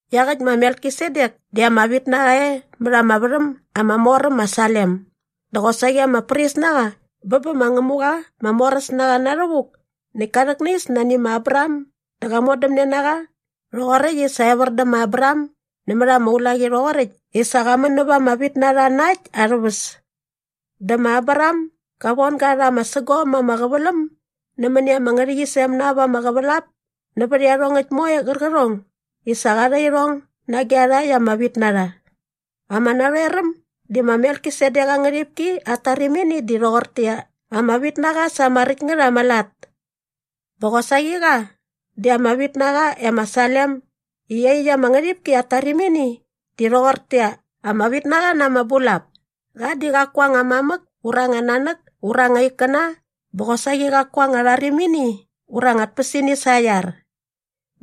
Iaqäkt ma Melkisedek di ama vitnaqa e mät ama värhäm ama mor äm ma Salem dä qosaqi ama pris na qa bä bä ma Ngämuqa ma Moräsnaqa Na Rhävuk näkt ka rhäknais nani ma Abraham dä qa modämne na qa rhoqoräkt i sa evär dä ma Abraham nämät ama ulaqi rhoqoräkt i sa qa män näva ama vitnarha na äkt arhä väs. Dä ma Abraham ga von ga rha ama sägom ama qäväläm nämäni ama ngärhäqyisem na ap ama qävälap nävät iarhongäkt moe qärqärhong i sa qa rha irhong nage iarhakt ama vitnarha. Ama narhoeräm di ma Melkisedek aa ngärhipki at tarimini di rhoqortäqyia, ama vitnaqa sa ama räkt ngät ama lat. Bä qosaqi qa di ama vitnaqa e ma Salem i iaqyäkt ama ngärhipki at tarimini di rhoqortäqyia, ama vitnaqa na ama bulap. Qa di qaku aa anga mamäk ura anga nanäk ura anga ikkäna bä qosaqi qaku aa anga rharimini ura anga tpäsini sa aa iar.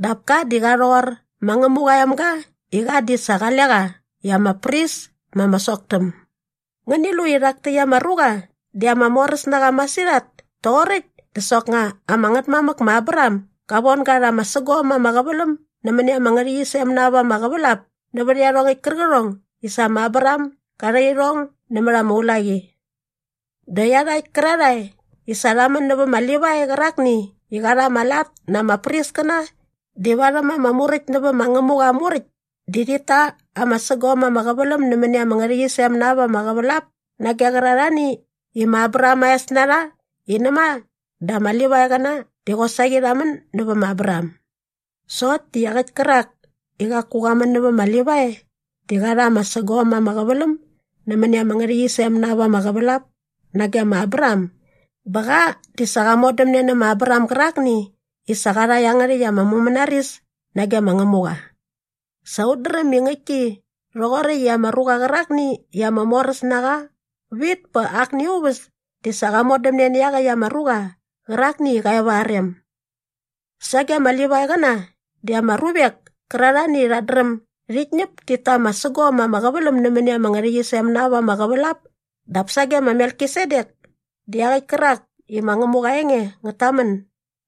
Dap ka di qa rhoqor ma Ngämuqa aa emga i qa di sa qale qa i ama pris ma ama soktäm. Ngäni lu i rhak täkt ama ruqa di ama moräs na qa masirhat toqoräkt dä soknga ama ngätmamäk ma Abraham ga von ga rha ama sägom ama qäväläm nämäni ama ngärhäqyisem na ap ama qävälap nävät iarhongäkt kärqärhong i sa ma Abraham ga rha irhong nämät ama ulaqi! Dä iarhakt kärarhae i sa rha män nävä ma Livai qärakni i qa rha ama lat na ama priskäna di varhäm ama muräkt nävä ma Ngämuqa aa Muräkt di rhit ta ama sägom ama qäväläm nämäni ama ngärhäqyisem na ap ama qävälap nage qärarhani i ma Abraham aa es na rha i näma dä ama Livaiqäna di qosaqi rha män nävä ma Abraham. Sokt di iaqäkt kärak i qaku qa män nävä ma Livai di qa rha ama sägom ama qäväläm nämäni ama ngärhäqyisem na ap ama qävälap nage ma Abraham bä qa di sa qa modämne nä ma Abraham gärakni i sa qa rha iangärhäkt ama mumänaris nage ma Ngämuqa. Sa ut dräm i ngäktki rhoqoräkt i ama ruqa qärakni i ama moräs na qa vit pät akni aa uväs di sa qa modämne nä iaqäkt ama ruqa qärakni i qa e va aa rem. Sage ama Livaiqäna di ama ruvek kärarhani i rhat dräm dit ñäp tit ta ama sägom ama qäväläm nämäni ama ngärhäqyisem na ap ama qävälap dap sage ma Melkisedek di iaqäkt kärak i ma Ngämuqa aa enge ngät tamän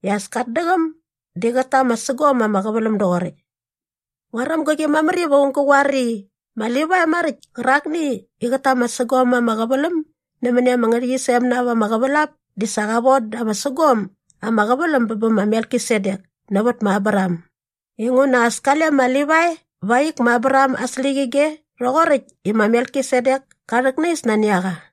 i as kat däqäm di qät ta ama sägom ama qäväläm doqoräkt. Nguaräm gäqi mamär iva aung gä qoar i ma Livai maräkt kärakni i qät ta ama sägom ama qäväläm nämäni ama ngärhäqyisem na ap ama qävälap di sa qa von da ama sägom ama qäväläm bä bä ma Melkisedek nävät ma Abraham inguna as kale ma Livai va aa ik ma Abraham aa släqyige rhoqoräkt i ma Melkisedek ka rhäknais nani a qa.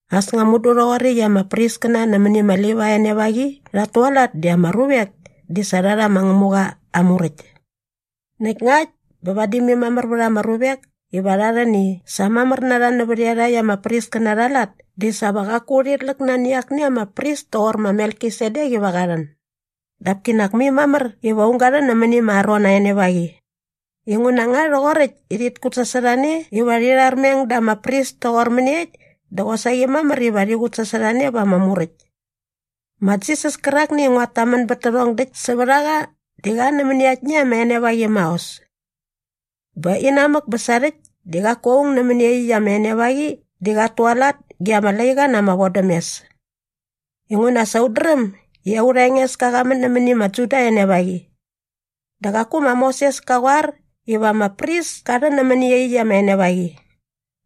As nga mudu rhoqoräkt i ama priskäna nämäni ma Livai aa enevaqi rhat tualat di ama ruvek di sa rha rha ma Ngämuqa aa Muräkt. Näkt ngakt bä vadi mai mamär vät ama ruvek iva rha rhän i sa mamär na rha nävät iarhakt ama priskäna arha lat di sa va qaku urhit läk nani akni ama pris toqor ma Melkisedek iva qa rhän. Dap kinak mai mamär iva aung ga rhän nämäni ma Aron aa enevaqi. Inguna nga rhoqoräkt i rhit kutsasorhane iva rhi rharmeng da ama pris toqor mäniekt dä qosaqi mamär iva rhi qutsasorhane va ama Muräkt. Ma Jisas kärakni i nguat tamän bät tärhong däkt sävät a qa di qa nämäni aktni ama enevaqi maos. Bä inamäk bä sarhäkt di qaku aung nämäni iaqyäkt ama enevaqi di qat tualat ge ama laiqa na ama vodämes. Inguna sa ut dräm i aurha Engeska qa män nämäni ma Juda aa enevaqi. Dä qaku ma Moses ka qoar iva ama pris ka rhän nämäni iaqyäkt ama enevaqi.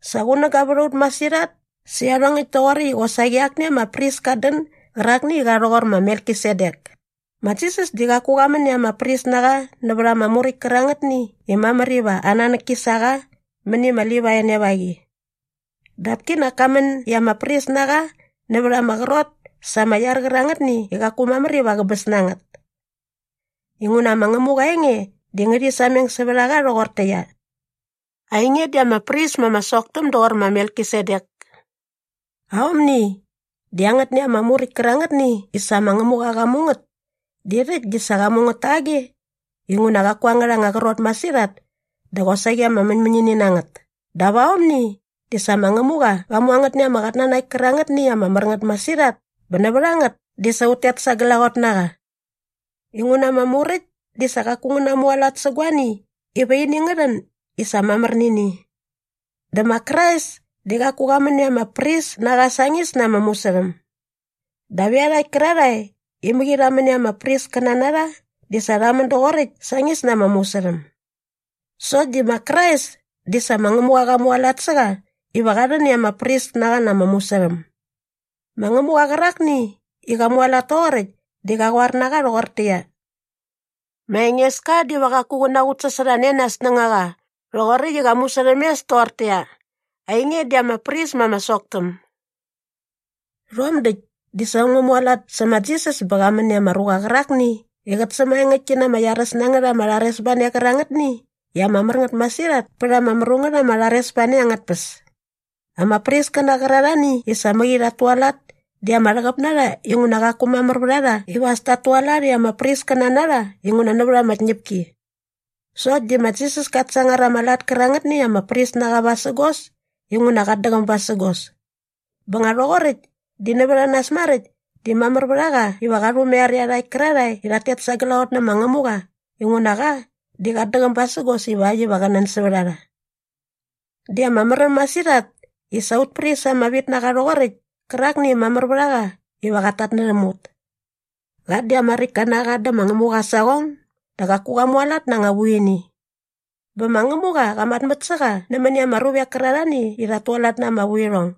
Sa qunäga vät a ut masirhat sä iarhongäkt toqoräkt i qosaqi akni ama pris kat dän gärakni i qa rhoqor ma Melkisedek. Ma Jisas di qaku qa män i ama pris na qa nävät ama muräkt kärangätni i mamär iva aa nanäk ki sa qa mäni ma Livai aa enevaqi. Dap kinak ka män i ama pris na qa nävät ama qrot sa ama iar qärangätni i qaku mamär iva qäbäs na ngät. Inguna ma Ngämuqa aa enge di ngärhi sameng sävät a qa rhoqortäqyia, “Ainge di ama pris ma ama soktäm doqor ma Melkisedek.” Aomni di angätni ama muräkt kärangätni i sa ma Ngämuqa qa mu ngät di rhäkt di sa qa mu ngät tage inguna qaku angärha anga qrot masirhat dä qosaqi ama mäñmäñini na ngät dap aomni di sa ma Ngämuqa qa mu angätni ama qatnanakt kärangätni i ama mär ngät masirhat bä nävät a ngät di sa ut tet sa glaqot na qa. Inguna ama Muräkt di sa qaku ngä namualat sä guani iva ini ngä rhän i sa mamär nä ini. Dä ma Krais di qaku qa män i ama pris na qa sañis na ama musärhäm. Dap iarhakt kärarhae i mäqi rha män i ama priskäna na rha di sa rha män doqoräkt sañis na ama musärhäm. Sokt di ma Krais di sa ma Ngämuqa qa mualat sä qa iva qa rhän i ama pris na qa na ama musärhäm. Ma Ngämuqa qärakni i qa mualat toqoräkt di qa qoar na qa rhoqortäqyia, “Ma Engeska diva qaku qä naqutsasorhane nä aa snängaqa rhoqoräkt i qa musärhämes toqortäqyia, ‘Ainge di ama pris ma ama soktäm.’” Rhom däkt di sa äm ngä mualat sä ma Jisas bä qa män i ama ruqa qärakni i qät sämaengäktki na ama iaräs na ngät ama rharesbane qärangätni i ama mär ngät masirhat pät ama mru ngät ma rharesbane angät tpäs. Ama priskäna qärarhani i sa mäqi rhat tualat di ama rhäqäp na rha inguna qaku mamär vät a rha iva as tat tualat i ama priskäna na rha inguna nävät ama tñäpki. Sokt di ma Jisas kat sangar ama lat kärangätni i ama pris na qa vasägos inguna qat däqäm basägos. Bä nga rhoqoräkt di nävät a nas maräkt di mamär vät a qa iva qa rhumaiar iarhakt kärarhae i rhat tet sa glaqot nä ma Ngämuqa inguna qa di qat däqäm basägos ivakt iva qä nän sävät a rha. Di ama märäm masirhat i sa aut pris ama vit na qa toqoräkt kärakni i mamär vät a qa iva qat tatnärhäm ut. Qa di ama räktka na qa dä ma Ngämuqa aa saqong dä qaku qa mualat na anga vuini. Bä ma Ngämuqa qa matmät sä qa nämäni ama ruvek kärarhani i rhat tualat na ama vuirhong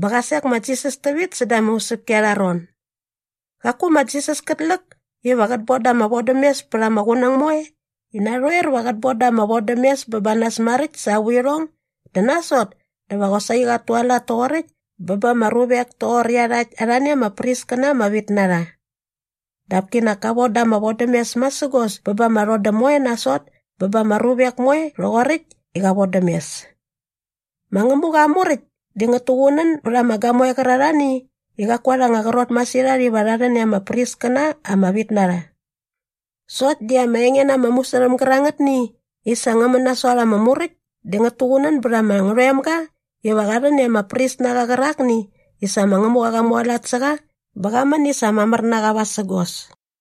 bä qa sek ma Jisas tävit säda ama usäpki arha ron. Qaku ma Jisas kät läk iva qät boda ama vodämes pät ama qunäng moe i narhoer va qät boda ama vodämes bä ba nas maräkt sa aa vuirhong dä nasot dä va qosaqi qat tualat toqoräkt bä ba ama ruvek toqor iarhakt arhani ama priskäna ama vit na rha. Dap kinak ka voda ama vodämes masägos bä ba ama rhodäm moe nasot bä ba ama ruvek moe rhoqoräkt i qa vodäm mes. Ma Ngämuqa aa Muräkt di ngät tuqunän bät ama gamoe qärarhani i qaku arha anga qrot masirhat iva rha rhän i ama priskäna ama vit na rha. Sokt di ama enge na ama musärhäm gärangätni i sa ngä män nasot ama Muräkt di ngät tuqunän bät ama ngärhoemga iva qa rhän i ama pris ama vit na qa qärakni i sa ma Ngämuqa qa mualat sä qa bä qa män i sa mamär na qa vasägos.